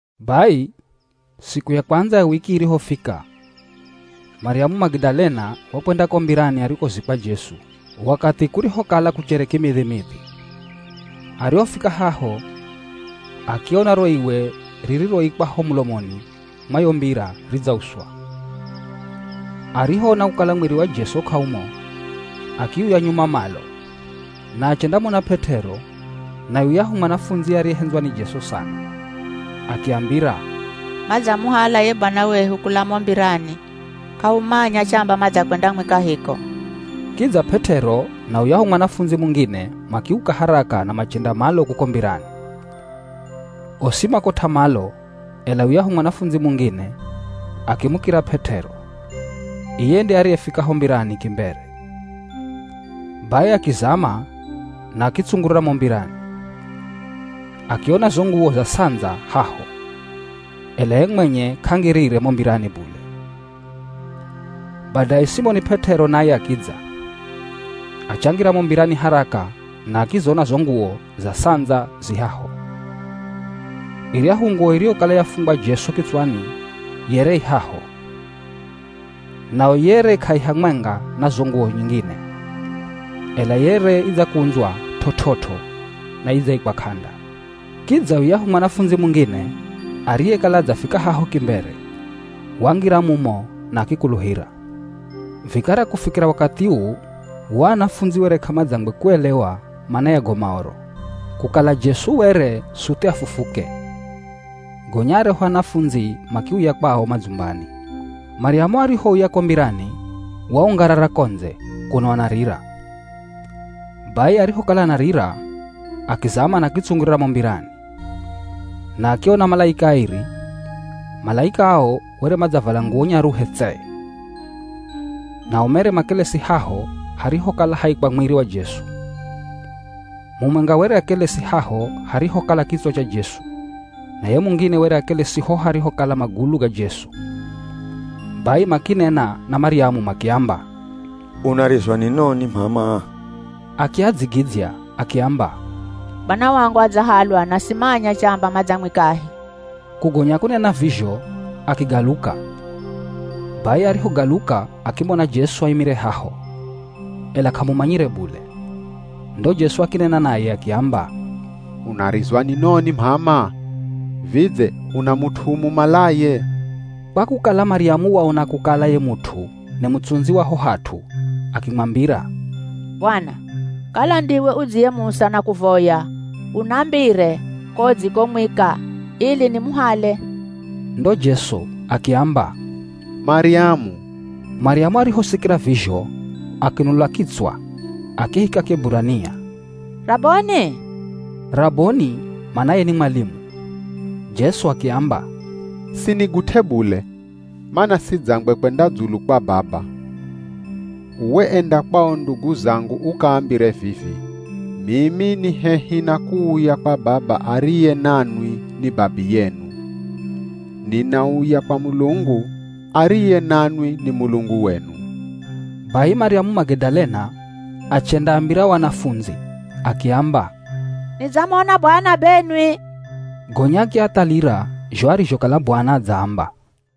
Bai siku ya kwandza ya wiki irihofika, Maryamu Magidalena wakwenda ko mbirani arikozikwa Jesu wakathi kurihokala kuchere kimidhimidhi. Arihofika haho, akiona ro iwe ririroikwa ho mulomoni mwa yo mbira ridzauswa. Arihoona kukala mwiri wa Jesu k'aumo, akiuya nyuma malo. Na achendamona P'et'ero na yuyahu mwanafundzi ariyehendzwa ni Jesu sana. Akiambira, “Madzamuhala ye Bwana wehu kula mo mbirani! K'ahumanya chamba madzakwendamwika hiko.” Kidza P'et'ero na yuyahu mwanafundzi mungine makiuka haraka na machenda malo kuko mbirani. Osi makot'a malo, ela yuyahu mwanafundzi mungine akimukira P'et'ero. Iye nde ariyefika ho mbirani kimbere. Bai akizama na akitsungurira mo mbirani. Akiona zo nguwo za ts'andza haho, ela ye mwenye k'angirire mo mbirani bule. Badaye Simoni P'et'ero naye akidza. Achangira mo mbirani haraka na akizona zo nguwo za ts'andza zi haho. Iryahu nguwo iriyokala yafungwa Jesu kitswani yere i haho, nayo yere k'aihamwenga na zo nguwo nyingine, ela yere idzakundzwa t'ot'ot'o na idzaikwa k'anda. Kidza yuyahu mwanafundzi mungine, ariyekala adzafika haho kimbere, wangira mumo na akikuluhira. Vikara kufikira wakathi uu o anafundzi were k'amadzangwe kuelewa mana ya go Maoro, kukala Jesu were suthi afufuke. Gonya aryahu anafundzi makiuya kwao madzumbani. Maryamu arihouya ko mbirani waungarara ko ndze, kuno anarira. Bai arihokala anarira, akizama na akitsungurira mo mbirani, na akiona malaika airi. Malaika ao were madzavala nguwo nyaruhe tse. Nao mere makelesi haho harihokala haikwa mwiri wa Jesu. Mumwenga were akelesi haho harihokala kitswa cha Jesu, na ye mungine were akelesi ho harihokala magulu ga Jesu. Bai makinena na Maryamu makiamba, “Unarizwa ni noni, m'ama?” Akiadzigidzya, akiamba, “Bwana wangu adzahalwa na simanya chamba madzamwikahi!” Kugonya kunena vizho, akigaluka. Bai arihogaluka akimona Jesu aimire haho, ela k'amumanyire bule. Ndo Jesu akinena naye akiamba, “Unarizwa ni noni m'ama? Vidze una mut'u umumalaye?” Kwa kukala Maryamu waona kukala ye mut'u ni mutsundzi wa ho hat'u akimwambira, “Bwana, kala ndiwe udziyemusa nakuvoya unambire ko udzikomwika, ili nimuhale.” Ndo Jesu akiamba, “Maryamu!” Maryamu arihosikira vizho akinula kitswa akihika Kieburania, “Raboni!” (Raboni manaye ni mwalimu.) Jesu akiamba, “Sinigut'e bule, mana sidzangwe kwenda dzulu kwa Baba. Uwe, enda kwa o ndugu zangu ukaambire vivi, ‘Mimi ni hehi na kuuya kwa Baba ariye nanwi ni Babiyenu, ninauya kwa Mulungu, ariye nanwi ni Mulungu wenu.’” Bai Maryamu Magidalena achendaambira o anafundzi, akiamba, “Nidzamona Bwana benwi!” Gonya akiathalira zho arizhokala Bwana adzaamba.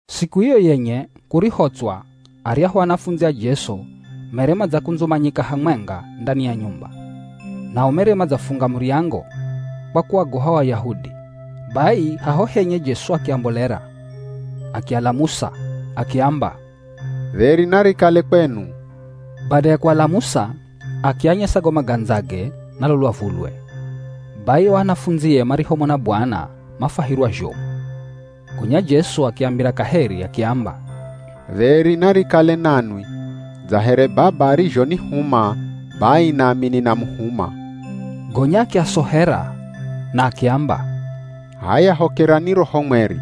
Siku iyo yenye kurihotswa aryahu anafundzi a Jesu mere madzakundzumanyika hamwenga ndani ya nyumba. Nao mere madzafunga muryango kwa kuaogoha o Ayahudi. Bai haho henye Jesu akiambolera. Akialamusa, akiamba, “Dheri narikale kwenu.” Bada ya kualamusa akianyesa go magandzage na lo lwavulwe. Bai o anafundzie marihomona Bwana mafwahirwa zhomu. Gonya Jesu akiambira kaheri akiamba, “Dheri narikale nanwi. Dza here Baba arizhonihuma, bai nami ninamuhuma.” Gonya akiasohera na akiamba, “H'aya hokerani Roho Mweri.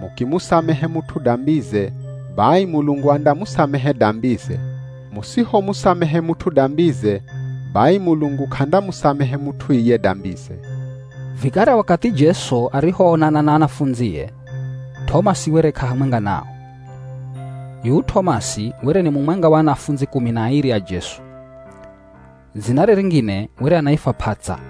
Mukimusamehe mut'u dambize, bai Mulungu andamusamehe dambize. Musihomusamehe mut'u dambize, bai Mulungu k'andamusamehe mut'u iye dambize.” Vikara wakathi Jesu arihoonana na anafundzie T'omasi were k'ahamwenga nao. Yuyu T'omasi were ni mumwenga wa anafundzi kumi na airi a Jesu. Dzinare ringine were anaifwa P'ats'a.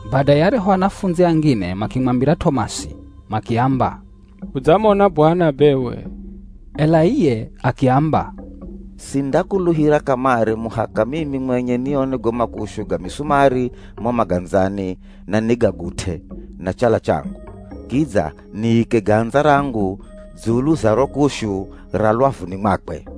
Badaye aryahu anafundzi angine makimwambira T'omasi, makiamba, “Hudzamona Bwana bewe!” Ela iye akiamba, “Sindakuluhira kamare muhaka mimi mwenye nione go makushu ga misumari mo magandzani na nigagut'e na chala changu, kidza niike gandza rangu dzulu za ro kushu ra lwavuni mwakwe.”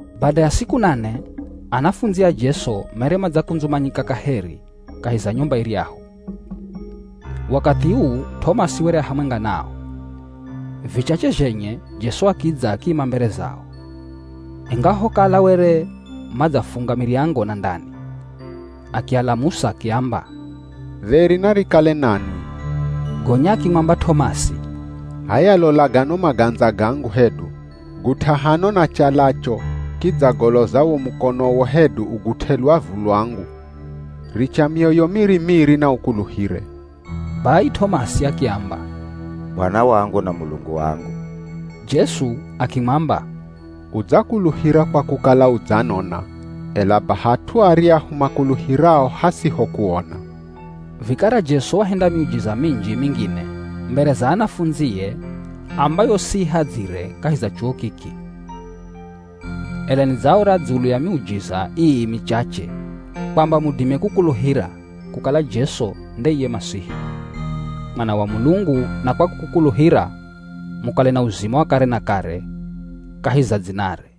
Bada ya siku nane, anafundzi a Jesu mere madzakundzumanyika kaheri kahi za nyumba iryahu. Wakathi uu T'omasi were a hamwenga nao. Vichache zhenye Jesu akidza akiima mbere zao, ingahokala were madzafunga miryango na ndani. Akialamusa akiamba, “Dheri narikale nanwi.” Gonya akimwamba T'omasi, “H'aya lola gano magandza gangu hedu, gut'a hano na chalacho kidza goloza wo mukonowo hedu ugut'e lwavu lwangu. Richa mioyo miri-miri na ukuluhire.” Bai T'omasi akiamba, “Bwana wangu na Mulungu wangu!” Jesu akimwamba, “Udzakuluhira kwa kukala udzanona, ela baha at'u aryahu makuluhirao hasiho kuona.” Vikara Jesu wahenda miujiza minji mingine mbere za anafundzie ambayo siihadzire kahi za chuwo kiki. Ela nidzaora dzulu ya miujiza ii michache kwamba mudime kukuluhira kukala Jesu nde iye Masihi, Mwana wa Mulungu na kwa kukuluhira, mukale na uzima wa kare na kare kahi za dzinare.